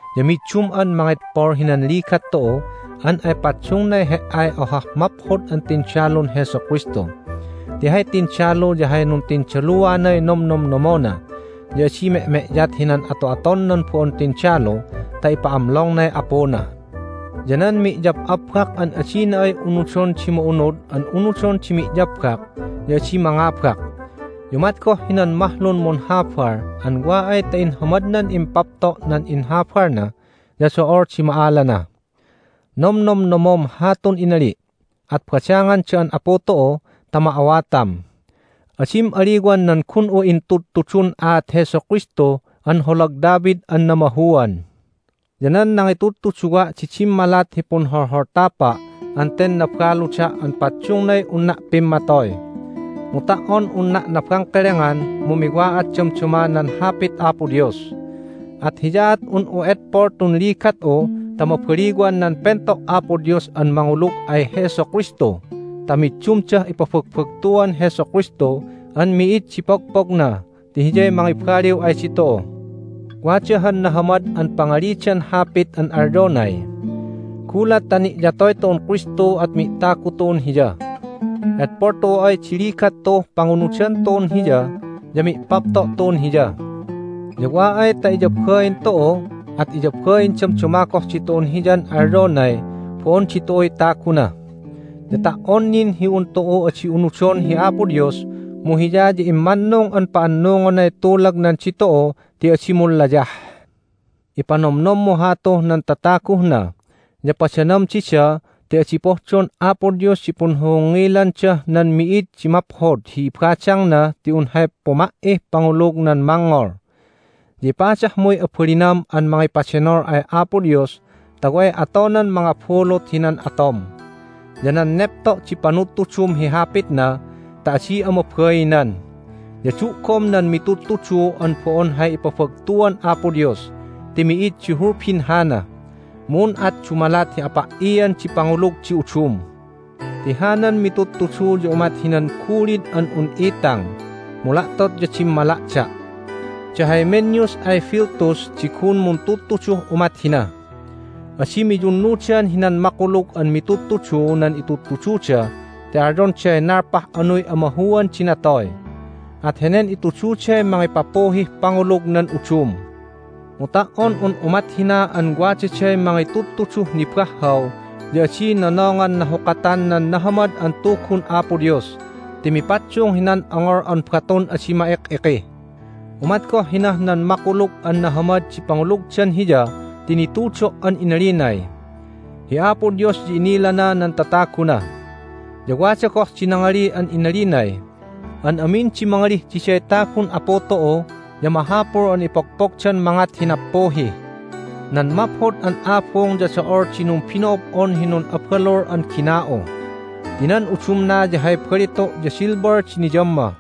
Ya middum'an mangedpol hinan ligat tu'u an ay paddungnay he"ay ohah maphod an tindalun Jesu Kristu. Ti hay tindalu ya hay nuntindaluanay nomnomnomona, ya adi me'me'yat hinan ato'aton nan bo'on tindalu ta ipa'amlongnay apuna. Ya nan mi'yab'abbak an adina ay unudon di ma'unud an unudon di mi'yabbak ya adi mangabak. Ya umat goh hinan mahlun munhabal an wa ay ta inhamadnan impapto' nan inhabalna ya do'ol di ma'alana. Nomnomnomom hatun inali', at badangan da'an Apu tu'u ta ma'awatam. Adim aliwan nan gun'u intudtudun aat Jesu Kristu an holag David an namahuan. Ya nan nangitudtuduwa' di dimmalat hi punholholtapa' an ten nabaluda' an paddungnay unna' pimmatoy. Mu ta"on unna' nabangkelengan mu miwa'at damdama nan Hapit Apo Dios! At hiyaat un'u edpol tun ligat'u ta mabaliwan nan pento' Apo Dios an mangulug ay Jesu Kristu ta middumdah ipabagbagtuan Jesu Kristu an mi'id di pogpogna ti Hiyay mangibaliw ay ditu'u. Wada han nahamad an pangalidan hapit an alyonay, "Gulat ta ni'yatoy tu'un Kristu at mi'tagu tu'un Hiya. Edpol tu'u ay di ligat tu'uh pangunudan tu'un Hiya ya mi'papto' tu'un Hiya. Ya wa ay ta iyabain tu'u at iyabain damdama goh ditu'un Hiyan alyonay bo'on ditu'uy taguna. Ya ta"on nin hi un tu'u adi unudon hi Apo Dios mu Hiya ya immannung an pa'annungonay tulagnan ditu'u ti adi munlayah." Ipanomnommu hatuh nan tataguh na, ya padanam dida ti adi pohdon Apo Dios di punhohongngilandah nan mi'id di maphod hi ibadangna ti un hay puma"ih pangulug nan mangngol. Ya ipadahmuy abalinam an mangipadenol ay Apo Dios ta way atonan mangabulut hinan atom. Ya nan nepto' di panudtudum hi Hapitna ta adi'a mabainan. Ya du'gom nan mitudtudu an bo'on hay ipabagtuan Apo Dios ti mi'id di hulbin hana, mu un at dumalat hi apa"ian di pangulug di udum. Ti hanan mitudtudu ya umat hinan gulid an un itang, mu la'tot ya dimmala'da'. Da Hymenaeus ay Philetus di gun muntudtuduh umat hina. Adi miyunnudan hinan makulug an mitudtudu nan itudtududa ti alyonday nalpah anuy amahuan di natoy. At henen itududay mangipapuhih pangulug nan udum. Mu ta"on un umat hina an wadaday mangitudtuduh nibahhaw ya adi nonongan nahukatan nan nahamad an Tugun Apo Dios ti mipaddung hinan ongol an batun adi ma'ik'iki. Umat goh hinah nan makulug an nahamad di pangulugdan Hiya ti nitudo' an inalinay, "Hi Apo Dios ya inilana nan tataguna." Ya wada goh di nangali an inalinay, "An amin di mangalih diday tagun Apu tu'u ya mahapul an ipogpogdan mangat hi nappuhi." Nan maphod an abung ya do'ol di numbino'ob'on hi nun'abalul an gina'u. Ti nan udumna ya hay balitu' ya silver di niyamma,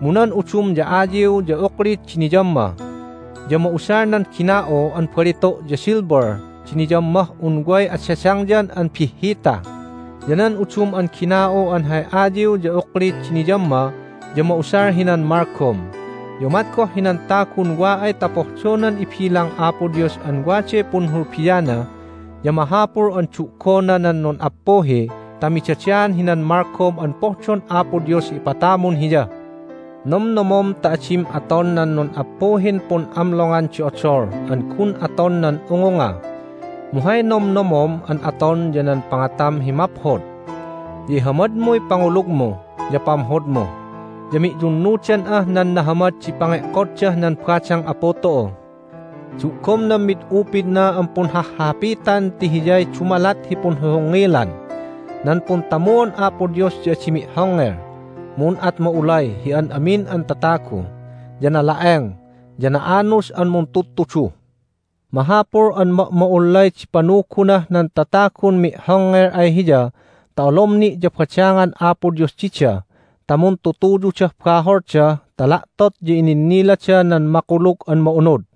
mu nan udum ya ayiw ya uklit di niyamma. Ya ma'usal nan gina'u an balitu' ya silver di niyammah un way adadangyan an bihhita, ya nan udum an gina'u an hay ayiw ya uklit di niyamma ya ma'usal hinan malgom. Ya umat goh hinan tagun wa ay ta pohdonan ibilang Apo Dios an waday punhulbiana ya mahapul an du'gona nan nun'appuhi ta midadaan hinan malgom an pohdon Apo Dios hi ipatamun hiya. Nomnomom ta adim aton nan nun'appuhin pun'amlongan di odol an gun aton nan ungunga, mu hay nomnomom an aton ya nan pangatam hi maphod, ya ihamadmuy pangulugmu ya pamhodmu, ya mi'yunnudan'ah nan nahamad di pange'koddah nan badang Apu tu'u. Du'gom nan mid upidna an punhahhahapitan ti hiyay dumalat hi punhohongngilan. Nan puntamuon Apo Dios ya adi mi'hongngel, mu un at ma'ulay hi an amin an tatagu, ya nala'eng, ya na'anus an muntudtudu. Mahapul an ma'ma'ullay di panugunah nan tatagun mi'hongngel ay hiya ta olom ni' ya badangan Apo Dios dida ta muntutuyudah baholda ta la'tot ya ininnilada nan Makulug an Ma'unud.